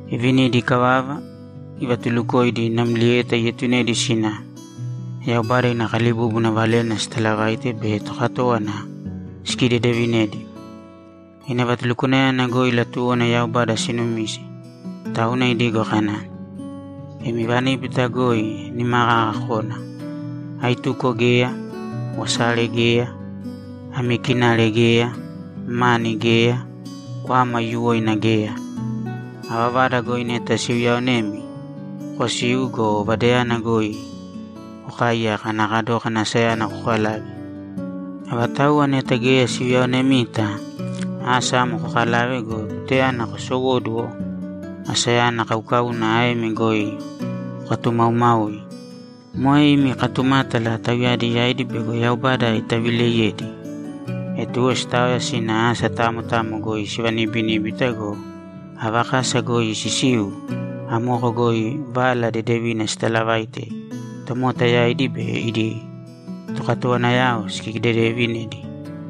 Ivinidi ikavava, ivatulukoidi namlieta ietunedi sina Yaubada ina kalibúbuna valena sitalavaite be tokatówana sikidedevinedi. Ina vatulukwanayana goi latuwona Yaubada sinumise, tauna idigo kana, ‘Imi vaníbita goi nima kaka kōna. Aituko geya, wasare geya, ami kinare geya, mani geya, kwama aiyuwoina geya. Ava vada goi neta siuyaonemi, kosīu go, vadayana goi kokaaiyāka ana kadókana asayana kokalave. Avatauwa neta geya siuyaonemita, asa amo kokalāve go, tutayana kosowóduwo asayana kaukauna aemi goi kokatumaumāui. Moe imi katumátala tauyadi yaidi bego Yaubada itavileiyedi.’ E tuwo sitaoya sina asa tamo tamo goi sivanibiníbita go, ava kasa goi sisiu, amoko goi Vala Dedevina sitaalavaite tomota yaidi be idi tokatowanayao sikidedeevinedi.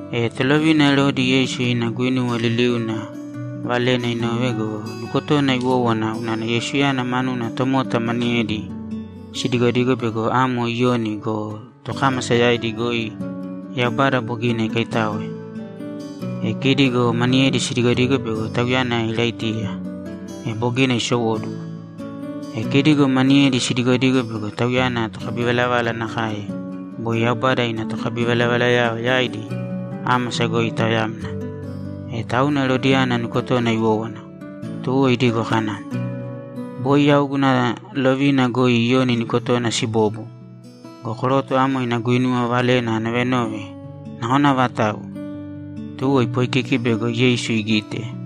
E tolovina Erodi Yeisu ina guinuwa liliuna valena inove go, nukotona iwówana unana Yeisuyana manuna tomota maniyedi sidigodigo bego amo Iyoni go, tokámasa yaidi goi Yaubada bogina ikaitáoe. E kidi go maniyedi sidigodigo bego Tauyana Iraitiya, e bogina isowóduwo. E kidi go maniyedi sidigodigo bego Tauyana tokabivalavala nakae boi Yaubada ina tokabivalavalayao yaidi ámasa goi itaoyamna. E tauna Erodiyana nukotona iwówana, tuwo idigo kana, ‘Boi yau guna lovina goi Iyoni nukotona sibobo. Go koroto amo ina guinuwa valena anovenove nakona avatau?’ Tuwo ipoikiki bego Yeisu igite.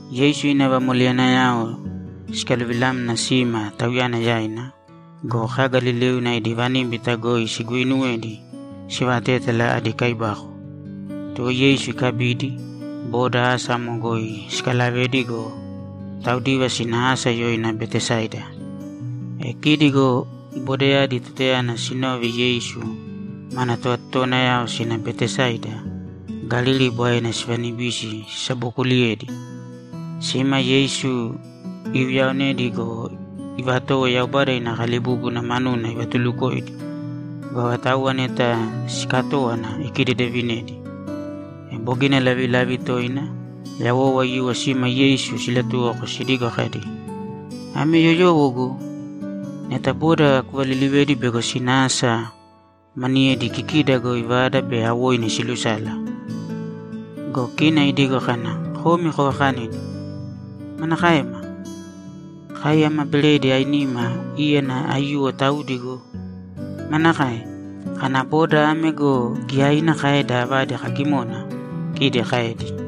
Yeisu ina vamoleyanayao sikaluvilamna sima Tauyana yaina go, kaga liliuna idi vaníbita goi siguuinuwedi sivatétala adi kaibako. Tuwo Yeisu ikabidi, boda asa amo goi sikalavedi go, taudiva sina asa yoina Betesaida. E kidi go bodayadi tutayana sinove Yeisu mana tovatotowanayao sina Betesaida, Galili Bwaena sivanibisi sisabokuliyedi. Sima, Yeisu iuyaonedi go, ivatowo Yaubada ina kalibúbuna manuna ivatulukoidi. Go avatauwa neta siikatówana ikidedevinedi. E bogina lavilavi toina yawou aiyuwo sima Yeisu silatuwoko sidigo kadi, ‘Ame yoyowo go! Neta boda kuvalilivēdi bego sina asa maniyedi kikida goi vada be awoinu silusala.’ Go kina idigo kana, ‘Komi kovakanīdi.’ ‘Manakaema? Kai ama beredi ainima, íyana aiyuwo taudi go! Manakae, kana boda ame go, giyaina kaeda avadi kagimona?’ kidi kaedi.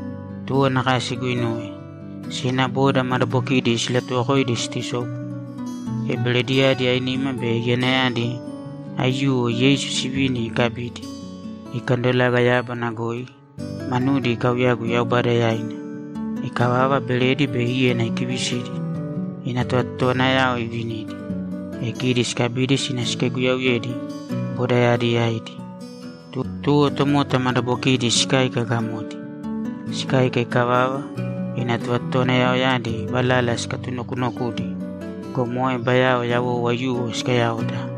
Tuwo nakae siguinuwe. Sina boda madabokidi silatuwokoidi situsobu. E berediyadi ainima be iyanayadi aiyuwo Yeisu sivini ikabidi, ikandolaga yábana goi, manudi ikauyagu Yaubada yaina. Ikavava, beredi be íyana ikivisidi, ina tovatotowanayao ivinidi, e kidi sikabidi sina sikaiguyauyedi bodayadi yaidi. Tuwo tomota madabokidi sikáika gamodi. Sikáika ikavava, ina tovatotowanayaoyadi valala sikatunokunokudi go, moe bayao yawou aiyuwo sikayaoda.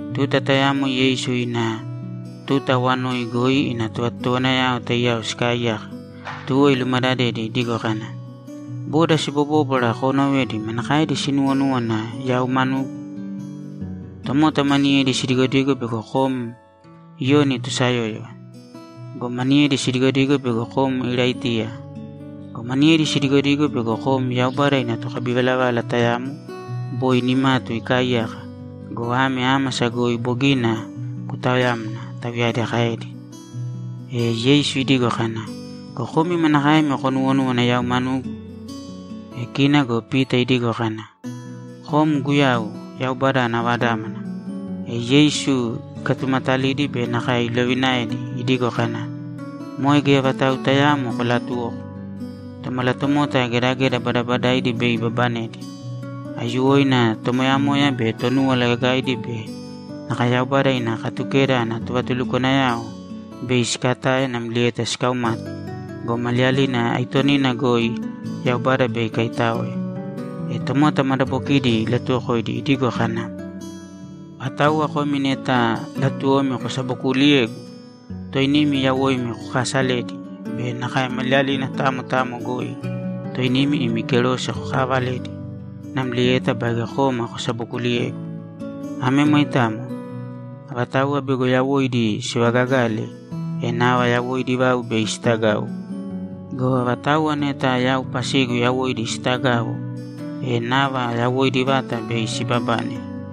Tuta tayamo Yeisu ina tuta awanoi goi ina tovatotowanayao taiyao sikaaiyaka, tuwo ilumadadedi idigo kana, ‘Boda sibobóbwara koonovedi manakaedi sinuuwonúwana yau manugu?’ ‘Tomota maniyedi sidigodigo bego kom Iyoni tosayóyova. Go maniyedi sidigodigo bego kom Iraitiya. Go maniyedi sidigodigo bego kom Yaubada ina tokabivalavala tayamo boi nimatu ikaaiyaka go, ame ámasa goi bogina kutaoyamna’, tauyadi kaedi. E Yeisu idigo kana, ‘Go komi manakaemi konuwonúwana yau manugu?’ E kina go Pita idigo kana, ‘Kom Guyau, Yaubada ana Vadámana!’ E Yeisu ikatumatalidi be nakae ilovinaedi idigo kana, ‘Moe geya vatau tayaamo kolaatuwōko. Tomalatomota gedageda badabadaidi bei ibabanedi. Aiyuwoina tomoyamoya be Tonúwala Gagaidi be nakae Yaubada ina Katukeda ana tovatulukwanayao bei sikatae namlieta sikaumate go, maliyalina aitonina goi Yaubada bei ikaitáoe.’ E tomota madabokidi ilatuwokoidi idigo kana, ‘Avatauwa komi neta latuwomi kosabokuuliyegu, toinimi yawoimi kokaasalēdi be nakae maliyalina tamo tamo goi toinimi imi kerose kokaavalēdi, namlieta baige kōma kosabokuliyēgu. Ame moitamo. Avatauwa bego yawoidi sivagagale, e nava yawoidi vau bei sitagau. Go avatauwa neta yau pasigu yawoidi sitagau, e nava yawoidi vata bei sibabane.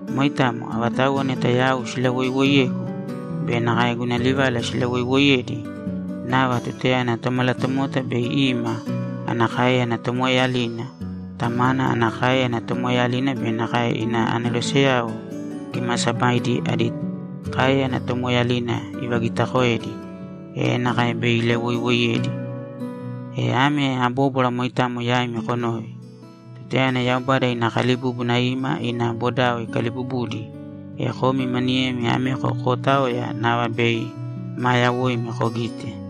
Moitamo. Avatauwa neta yau silawoiwoiyegu be nakae guna livala silawoiwoiyedi, nava tutayana Tomalatomota bei ima ana káeyana tomoeeyalina, Tamana ana káeyana tomoeeyalina be nakae ina aneroseyao kimaasabaidi adi káeyana tomoeeyalina ivagiitakoedi, e nakae bei ilawoiwoiyedi. E ame abóbwara moitamo yaimi konōve: Tutayana Yaubada ina kalibúbuna ima ina bodao ikaliibubudi, e komi maniyemi ameko kootaoya nava bei maa yawoimi kogite.’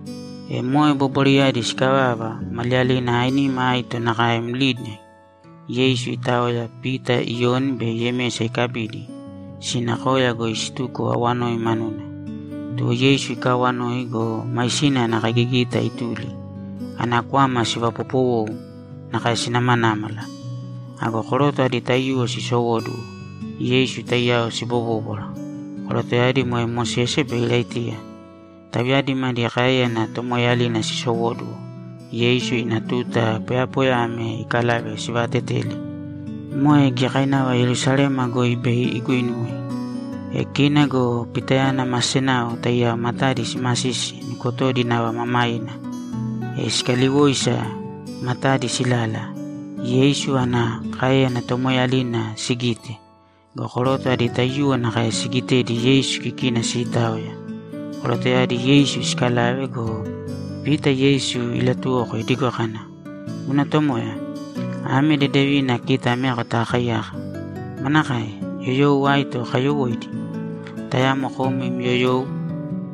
E moe bobwarayadi sikavava, maliyalina ainima aito nakae mlidi Yeisu itaoya, Pita, Iyoni be Yemesa ikabidi, sina koya goi situko awanoi manuna. Tuwo Yeisu ikaawanoi go, maisina ana kaigigita ituli. Ana kwama sivapopowou nakae sinamanámala. Ago koroto adi taiyuwo sisowóduwo, Yeisu taiyao sibobóbwara. Korotoyadi moe Mosese be Iraitiya. Tauyadi madi káeyana tomoeeyalina sisowóduwo, Yeisu ina tuta poyapoya ame ikalave sivaateteli. Moe giyakainava Yerusalema goi bei iguinuwe. E kina go Pitayana ma senao taiyao matadi simasisi nukotodi nava mamaina. E sikaliwoisa matadi silala, Yeisu ana káeyana tomoeeyalina sigite go, koroto adi taiyuwo nakae sigitedi Yeisu kikina siitaoya. Korotoyadi Yeisu siikalave go, Pita Yeisu ilatuwoko idigo kana, ‘Guna Tomoya, ame dedevina kita ameko takaaiyaka. Manakae? Yoyou aito kayowóidi? Tayamo kom im yoyou,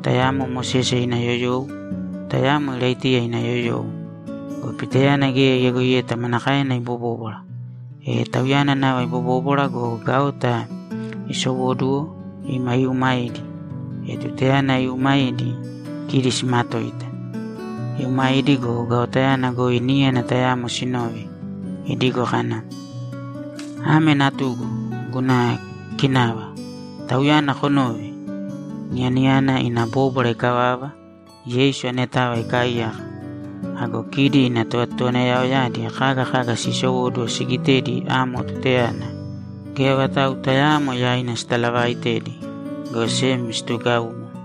tayamo Mosese ina yoyou, tayamo Iraitiya ina yoyou.’ Go Pitayana geya iyagoiyeta manakaena ibobóbwara. E tauyana nava ibobóbwara go, gaota isowóduwo ima iumaidi. E tutayana iiumaidi, kidi simatoita. Iumaidi go, gaotayana goi níyana tayamo sinove, idigo kana, ‘Ame Natugu, guna kinava. Tauyana konōve!’ Niyanayana ina bóbwara ikavava, Yeisu anetava ikaaiyaka. Ago kidi ina tovatotowanayaoyadi kaga kaga sisowóduwo sigitedi amo tutayana, geya vatau tayaamo yaina sitalavaitedi, go sem situgaumo.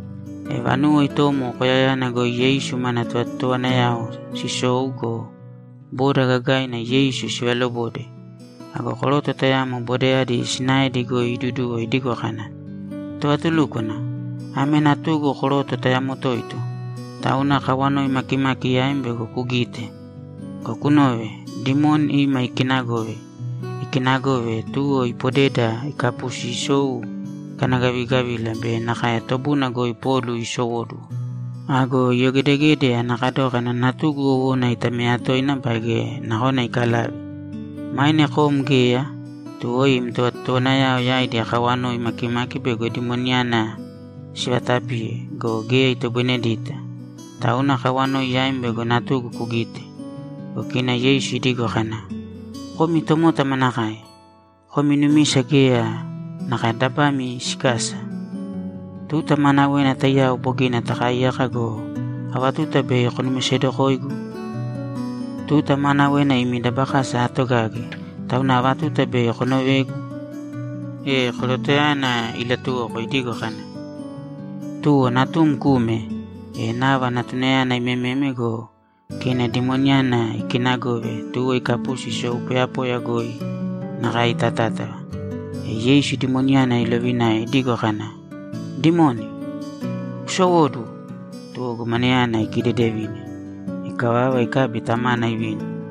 E vanuwo itomo koyayana goi Yeisu mana tovatotowanayao sisou go, boda gagaina Yeisu sivalobode. Ago koroto tayamo bodayadi sinaedi goi iduduwo idigo kana, ‘Tovatulúkwana, ame natugu koroto tayamo toito, tauna akawanoi makimaki yaim bego kugite. Go kunōve. Dimoni ima ikinagove. Ikinagove, tuwo ipodeda ikapusi isou ikanagavigavila be nakae tobuna goi polu isowóduwo. Ago iyogedegede ana kadókana natugu wowona itameya toina baige nakona ikalave. Maine kom geya, tuwo im tovatotowanayao yaidi akawanoi makimaki bego dimoniyana sivatapiye go, geya itoboinedita. Tauna akawanoi yaim bego natugu kugite.’ Go kina Yeisu idigo kana, ‘Komi tomota manakae? Komi numisa geya nakae dabami sikasa. Tuta maanawena taiyao bogina taakaiyaka go, ava tuta bei konumisedokoigu? Tuta maanawena imi dabakasa aatogage, tauna ava tuta bei konovegu?’ E korotoyana ilatuwoko idigo kana, ‘Tuwo natum kūme!’ E nava natunayana iimememe go, kina dimoniyana ikinagove, tuwo ikapusi isou poyapoya goi nakae itatátava. E Yeisu dimoniyana ilovinae idigo kana, ‘Dimoni, kusowōduwo!’ Tuwo gomanayana ikidedevine. Ikavava, ikabi tamana ivini.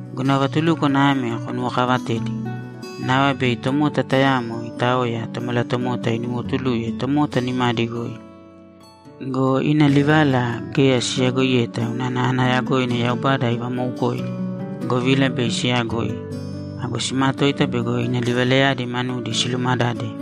‘Guna vatulúkwana ame konuwokavatēdi: Nava bei tomota tayamo itaoya, Tomalatomota inuwotuluye tomota nimadi goi.’ Go ina livala geya siyagoiyeta unana ana yagoina Yaubada ivamoukoidi, govila bei siyagoi. Ago simatoita bego ina livalayadi manudi silumadade.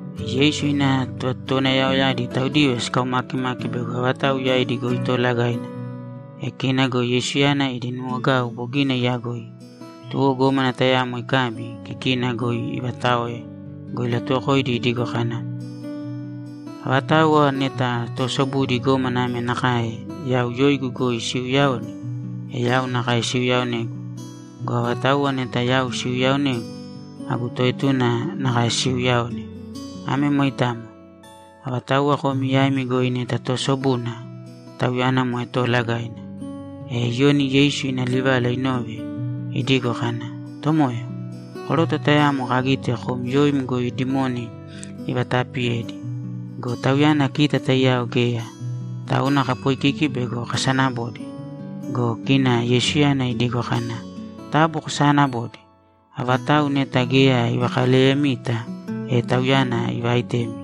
E Yeisu ina tovatotowanayaoyadi taudiva sikaumakimaki bego avatau yaidi goi toolagaina. E kina go Yeisuyana idi nuwogau bogina iyagoi, tuwo gómana tayamo ikabi, kikina goi ivataoe go, ilatuwokoidi idigo kana, ‘Avatauwa neta toosobudi gómana ame nakae yau yoigu goi siiuyaone, e yau nakae siuyaaonegu. Go avatauwa neta yau siuyaaonegu, agu toetuna nakae siiuyaone. Ame moitamo. Avatauwa komi yaimi goi neta toosobuna, tauyana moe toolagaina.’ E Iyoni Yeisu ina livala inove, idigo kana, ‘Tomoya, koroto tayamo kagite kom yoim goi dimoni ivataapiyedi go, tauyana kita taiyao geya, tauna kapoikiki bego kasanabode.’ Go kina Yeisuyana idigo kana, ‘Taabu kosaanabōde. Avatau neta geya ivakaleyemita, e tauyana ivaitemi.’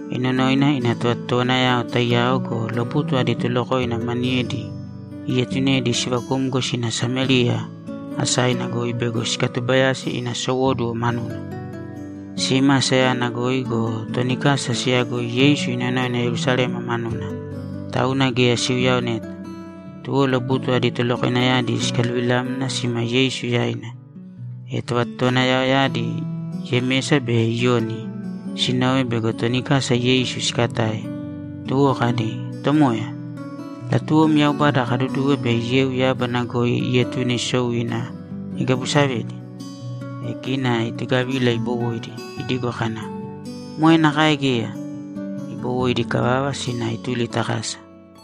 Inonoina ina tovatotowanayao taiyao go, lobutu adi tolokoina maniyedi ietunedi sivakumgo sina Samériya asaina goi bego sikatubayasi ina sowóduwo manuna. Sima asayana goi go, toni kasa siyagoi Yeisu inonoina Yerusalema manuna, tauna geya siuyaoneyeta. Tuwo lobutu adi tolokoinayadi sikaluvilamna sima Yeisu yaina. E tovatotowanayadi Yemesa be Iyoni sinove bego toni kasa Yeisu sikatae, tuwo kadi, ‘Tomoya, latuwom Yaubada kaduduwe bei yeu yábana goi ietune isou ina igabusavedi?’ E kina itugavila ibowoidi idigo kana, ‘Moe nakae geya!’ Ibowoidi ikavava, sina ituli ta kasa.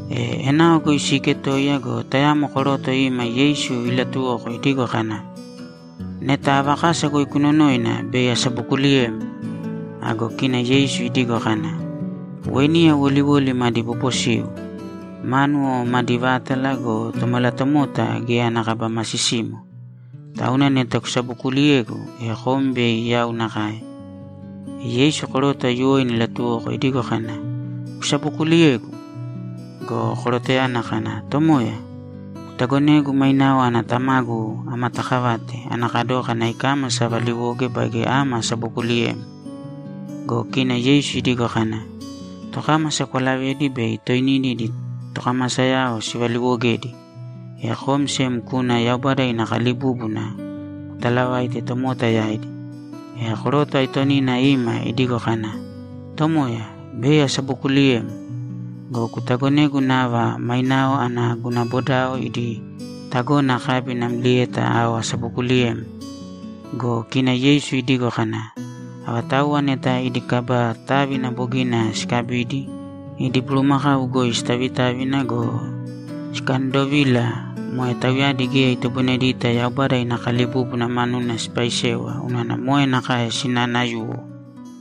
E enao goi siiketoiya go, tayamo koroto ima Yeisu ilatuwoko idigo kana, ‘Neta ava kasa goi kunonoina, bei asabokuliyem.’ Ago kina Yeisu idigo kana, ‘Weiniya woliwoli madi bobosiu, mánuwo madi vátala go, Tomalatomota geya ana kaba masisimo. Tauna neta kusabokuliyegu, e kom bei yau nakae.’ E Yeisu koroto aiyuwoina ilatuwoko idigo kana, ‘Kusabokuliyegu.’ Go korotoyana kana, ‘Tomoya, kutagonēgu mainao ana tamagu amatakavate ana kadókana ikámasa avaliwoge baige ama asabokuliyem.’ Go kina Yeisu idigo kana, ‘Tokámasa kwalavēdi bei toinidi idi tokamasayao sivaliiwogedi. E kom sem kūna Yaubada ina kalibúbuna kutalavāite tomota yaidi.’ E koroto aitonina ima idigo kana, ‘Tomoya, bei asabokuliyem. Go kutagonēgu nava mainao ana guna bodao idi tagona akabi namlieta ao asabokuliyem.’ Go kina Yeisu idigo kana, ‘Avatauwa neta idi kaba távina bogina sikabidi, idi bulumakau goi sitavitávina go, sikaandovila, moe tauyadi geya itoboinedita Yaubada ina kalibúbuna manuna sipaisewa unana moe nakae sinaanayuwo.’